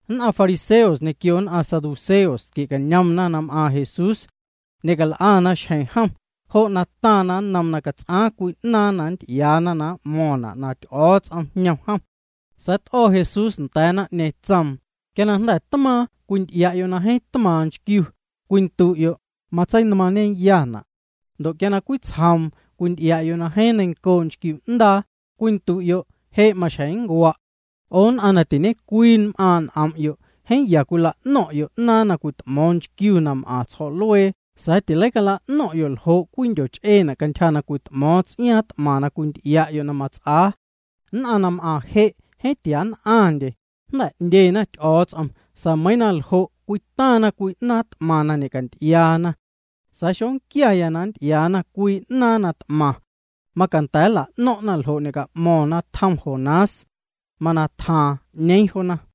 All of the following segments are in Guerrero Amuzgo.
Nn'aⁿ fariseos ñequio nn'aⁿ saduceos tquie'cañomna na m'aaⁿ Jesús. Ñe'cal'ana xjeⁿ jom, jo' na taⁿna nnoom na cats'aaⁿ cwii 'naaⁿ na nnty'iaana na m'mo̱o̱ⁿna' na Ty'o̱o̱ts'om jñom jom. Sa̱a̱ t'o̱ Jesús nda̱a̱ naⁿ'ñeeⁿ, tsoom: —Quia na jnda̱ tmaaⁿ cwinty'ia'yo' na jeeⁿ tmaaⁿ nchquiu, cwindu'yo': “Matseinmaaⁿñeyana'.” Ndo' quia na cwitsjoom cwinty'ia'yo' na jeeⁿ neiⁿncoo' nchquiu 'ndaa, cwindu'yo': “Je' maxjeⁿ nncua'.” 'O nn'aⁿ na tiñecwii m'aaⁿ' n'om'yo', jeeⁿ ya cwila'noⁿ'yo' 'naaⁿ na cwit'mo̱o̱ⁿ nchquiu na m'aⁿ tsjo̱'luee sa̱a̱ tileicala'no̱ⁿ'yo' ljo' cwii ndyoch'eetina' cantyja na cwit'mo̱o̱ⁿ ts'iaaⁿ t'maⁿ na cwinty'ia'yo' na mats'aa. Nn'aⁿ na m'aⁿ je' jeeⁿ tia nn'aⁿndye, jnda̱ 'ndyena Ty'o̱o̱ts'om sa̱a̱ meiiⁿ na ljo', cwitaⁿna cwii 'naaⁿ t'maⁿ na ñe'canty'iaana. Sa̱a̱ xonquiaya na nnty'iaana cwii 'naaⁿ na t'maⁿ. Macanda̱ cala'no̱ⁿ'na ljo' ñe'ca'mo̱ⁿna' juu na tjom Jonás. Mana tjaaⁿ, 'ñeeⁿ joona.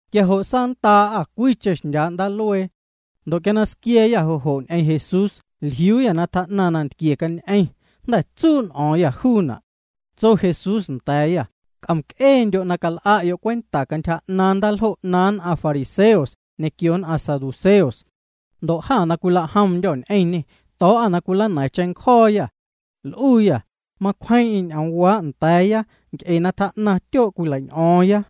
Quia jo' saanndaa'â cwiicheⁿ xndyaa' ndaaluee. Ndo' quia na squia̱a̱yâ jo' jo' ñ'eⁿ Jesús jliuuyâ na tjaa'naⁿ nantquie cañ'eⁿ, jnda̱ tsuu' n'o̱o̱ⁿyâ juuna'. Tso Jesús nda̱a̱yâ: —C'omc'eendyo' na cal'a'yo' cwenta cantyja 'naaⁿ' ndaaljo' 'naaⁿ nn'aⁿ fariseos ñequio nn'aⁿ saduceos. Ndo' jâ na cwila'jomndyô̱ ñ'eⁿñê to̱o̱'â na cwilana̱a̱ⁿ cheⁿncjo̱o̱yâ. L'uuyâ: —Macwjeeⁿ'eⁿ ñ'oomwaa' nda̱a̱ya nc'e na tjaa'naⁿ tyoo' cwilei'ñ'o̱o̱ⁿya.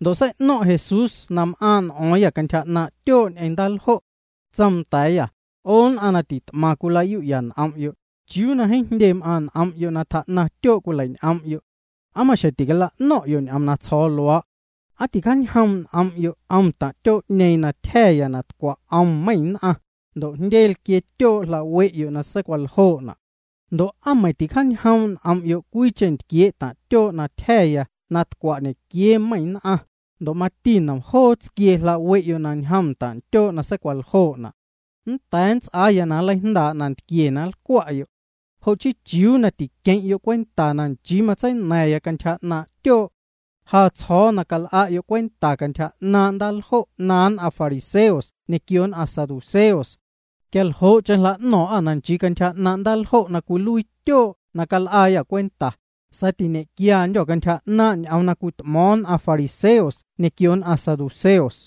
Ndo' sei'no̱ⁿ' Jesús na m'aaⁿ' n'o̱o̱ⁿyâ cantyja 'naaⁿ' tyoo' ñ'eⁿ ndaaljo'. Tsoom nda̱a̱yâ: —'O nn'aⁿ na tit'maⁿ cwila'yu'ya n'om'yo', ¿chiuu na jeeⁿ jndye m'aaⁿ' n'om'yo' na tjaa'naⁿ tyoo' cwilei'ñ'om'yo'? ¿Aa maxjeⁿ ticala'no̱ⁿ'yo' ñ'oom na tsjo̱o̱ luaa'? ¿Aa ticjaañjoom' n'om'yo' 'om taⁿ' tyoo'ñeeⁿ na tyja̱ya na tcwa' 'om meiⁿ nn'aⁿ, ndo' na jndye tsquiee tyoo' jla'we'yo' na seicwaljoo'na'? Ndo' ¿aa meiⁿ ticjaañjoom' n'om'yo' cwiicheⁿ ntquiee' taⁿ' tyoo' na tyja̱ya na tcwa' ñequiee meiⁿ nn'aⁿ, ndo' mati lojoo tsquiee ntaⁿ' tyoo' jla'we'yo' na seicwaljoo'na'? Nnda̱a̱ nnts'aa na nleijndaa' nantquie na nlcwa'yo'. Jo' chii ¿chiuu na tiqueⁿ'yo' cwenta na nchii matseina̱ⁿya cantyja 'naaⁿ' tyoo'? Ja tsjo̱o̱ na cal'a'yo' cwenta cantyja 'naaⁿ' ndaaljo' 'naaⁿ nn'aⁿ fariseos ñequio nn'aⁿ saduceos. Quia ljo'cheⁿ jla'no̱o̱ⁿ'â na nchii cantyja 'naaⁿ' ndaaljo' na cwiluii tyoo' na cal'aayâ cwenta, sa̱a̱ tañe'quiandyô̱ cantyja 'naaⁿ' ñ'oom na cwit'mo̱o̱ⁿ nn'aⁿ fariseos ñequio nn'aⁿ saduceos.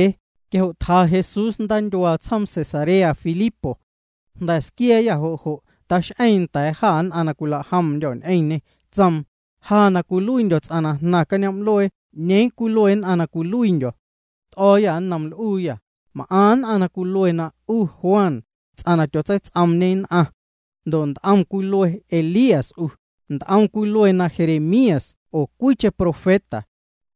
Quia jo' tja Jesús ndaatyuaa tsjoom Cesarea Filipo. Jnda̱ squia̱a̱yâ jo' jo' tax'eeⁿ nda̱a̱ jâ nn'aⁿ na cwila'jomndyô̱ ñ'eⁿñê, tsoom: —Ja na cwiluiindyo̱ ts'aⁿ na jnaⁿ cañoom'luee ¿'ñeeⁿ cwilue nn'aⁿ na cwiluiindyo̱? T'o̱o̱yâ nnoom l'uuyâ: —M'aⁿ nn'aⁿ na cwilue na 'u Juan, ts'aⁿ na tyotseits'oomñe nn'aⁿ. Ndo' nt'om cwilue Elías 'u, nt'om cwilue na Jeremías oo cwiicheⁿ profeta.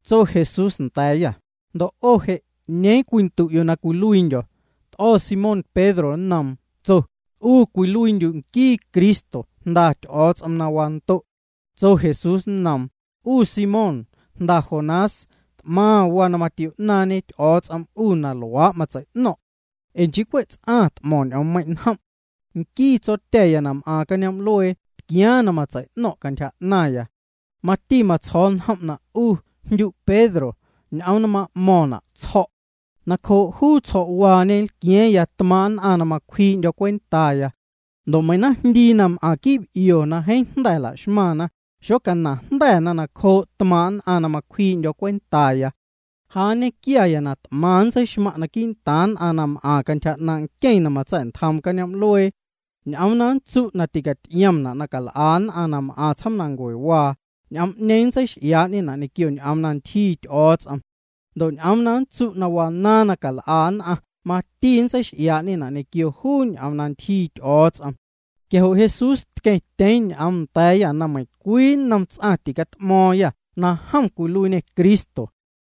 Tso Jesús nda̱a̱yâ: —Ndo' 'o je', ¿'ñeeⁿ cwindu'yo' na cwiluiindyo̱? T'o̱ Simón Pedro nnoom, tso: —'U cwiluiindyu' nquii Cristo, Jnda Ty'o̱o̱ts'om na wando'. Tso Jesús nnom: —'U Simón, jnda Jonás, t'maⁿ waa na matio'naaⁿñe Ty'o̱o̱ts'om 'u na luaa' matsei'no̱ⁿ'. Ee nchii cwe' ts'aⁿ na t'mo̱ⁿ ñ'oommeiⁿ' njom'. Nquii Tsotya̱ya na m'aaⁿ cañoom'luee tquiaaⁿ na matsei'no̱ⁿ' cantyja 'naⁿya. Mati matsjo̱o̱ njom' na 'u jndyu' Pedro, ñ'oom na ma'mo̱ⁿna' tsjo̱'. Nacjoo' juu tsjo̱'waañe nlqua̱a̱ⁿya tmaaⁿ' nn'aⁿ na macwjii'ndyo̱ cwentaya. Ndo' meiⁿ naⁿjndii na m'aⁿ quii' b'io na jeeⁿ jnda̱ cwila'xmaⁿna, xocanaⁿjnda̱na nacjoo' tmaaⁿ' nn'aⁿ na cwjii'ndyo̱ cwentaya. Ja nñequiaya na t'maⁿ nntseixmaⁿ' quii'ntaaⁿ nn'aⁿ na m'aⁿ cantyja 'naaⁿ' nqueⁿ na matsa̱'ntjoom cañoom'luee. Ñ'oom na nntsu' na ticaty'iomna' na cal'a nn'aⁿ na m'aⁿ tsjoomnancuewaa, ñ'oom'ñeeⁿ nntseix'iaa'ñena' ñequio ñ'oom na ntyjii Ty'o̱o̱ts'om. Ndo' ñ'oom na nntsu' na wanaaⁿ na cal'a nn'aⁿ mati nntseix'iaa'ñena' ñequio juu ñ'oom na ntyjii Ty'o̱o̱ts'om. Quia jo' Jesús tqueⁿtyeeⁿ ñ'oom nda̱a̱yâ na meiⁿcwii nnom ts'aⁿ ticat'mo̱o̱ⁿyâ na jom cwiluiiñê Cristo.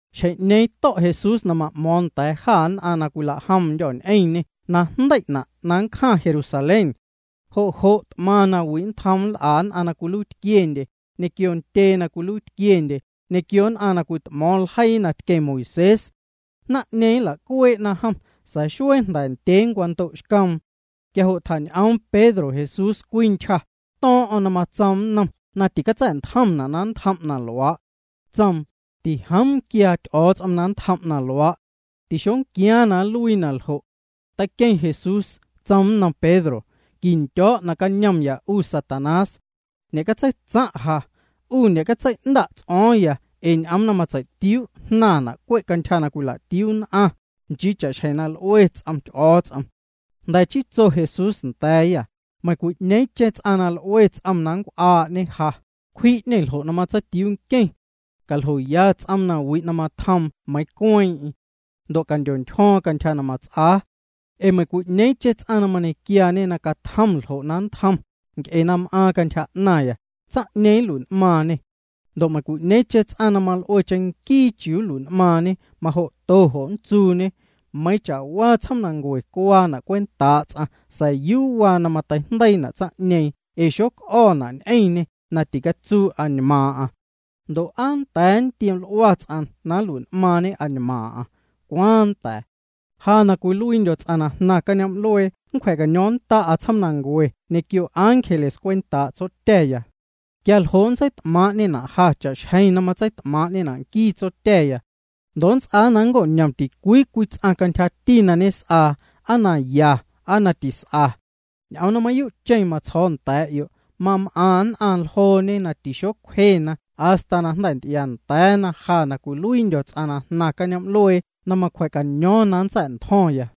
Xjeⁿ'ñeeⁿ to̱' Jesús na ma'mo̱o̱ⁿ nda̱a̱ jâ nn'aⁿ na cwila'jomndyô̱ ñ'eⁿñê na jndei'na' na nncjaⁿ Jerusalén. Jo' jo' t'maⁿ nawi' nntjoom nl'a nn'aⁿ na cwiluiitquiendye, ñequio ntyee na cwiluiitquiendye, ñequio nn'aⁿ na cwit'mo̱o̱ⁿ ljeii na tqueⁿ Moisés. Naⁿ'ñeeⁿ nla'cuee'na jom, sa̱a̱ xuee jnda̱ ndyee nncwando'xcoom. Quia jo' tjañ'oom Pedro Jesús cwii ntyja, to̱o̱ⁿ'o̱ⁿ na matsoom nnom na ticatsa̱'ntjomna' na nntjom na luaa'. Tsoom: —Tijoom quiaa Ty'o̱o̱ts'om na nntjom' na luaa'. Tixoquiaaⁿ na nluii naljo'. Teiqueⁿ Jesús tsoom nnom Pedro: —Quindyo̱o̱' nacañomya 'u Satanás. Ñe'catseitsaⁿ' ja. 'U ñe'catsei'nnda' ts'o̱o̱ⁿya ee ñ'oom na matsei'tiuu' jnaⁿna' cwe' cantyja na cwila'tiuu nn'aⁿ, nchii cha'xjeⁿ na l'ue ts'om Ty'o̱o̱ts'om. Jnda̱ chii tso Jesús nda̱a̱yâ: —Meiⁿcwi'ñeeⁿcheⁿ ts'aⁿ na l'ue ts'om na nncw'aa'ñe ja, cwji'ñê ljo' na matseitiuu nqueⁿ. Caljoya ts'oom nawi' na matjoom meiiⁿ cueeⁿ'eⁿ. Ndo' candyontyjo̱o̱ⁿ cantyja na mats'aa. Ee meiⁿcwi'ñeeⁿcheⁿ ts'aⁿ na mañequiaañe na catjom ljo' na nntjom, nc'e na m'aaⁿ cantyja 'naⁿya, tsaⁿ'ñeeⁿ nlui'n'maaⁿñê. Ndo' meiⁿcwi'ñeeⁿcheⁿ ts'aⁿ na mal'uee'ñe cheⁿnquii chiuu nlui'n'maaⁿñe, majo'to jo' nntsuuñe. Meiiⁿ cha'waa tsjoomnancue cuaana' cwentaa' ts'aⁿ sa̱a̱ yuu waa na mateijndeiina' tsaⁿ'ñeeⁿ ee xoc'o̱na' ñ'eⁿñê na ticatsuu añmaaⁿ'aⁿ. Ndo' ¿aa nnda̱a̱ nntioml'ua ts'aⁿ na nlui'n'maaⁿñe añmaaⁿ'aⁿ? ¿Cwaaⁿ nnda̱a̱? Ja na cwiluiindyo̱ ts'aⁿ na jnaⁿ cañoom'luee nncwja̱caño̱o̱ⁿnnda'a tsjoomnancue ñequio ángeles cwentaa' Tsotya̱ya. Quia ljo' nntseit'maaⁿ'ñena' ja cha'xjeⁿ na matseit'maaⁿ'ñena' nquii Tsotya̱ya. Ndo' nnts'aa na nnco'ñom ticwii cwii ts'aⁿ cantyjati na ñes'aa, aa na ya, aa na tis'a. Ñ'oom na mayuu' matsjo̱o̱ nda̱a̱'yo', mam'aⁿ nn'aⁿ ljooñe na tixocwjena hasta na jnda̱ nty'iaanda̱a̱na ja na cwiluiindyo̱ ts'aⁿ na jnaⁿ cañoom'luee na macwja̱caño̱o̱ⁿ na nntsa̱'ntjo̱ⁿya.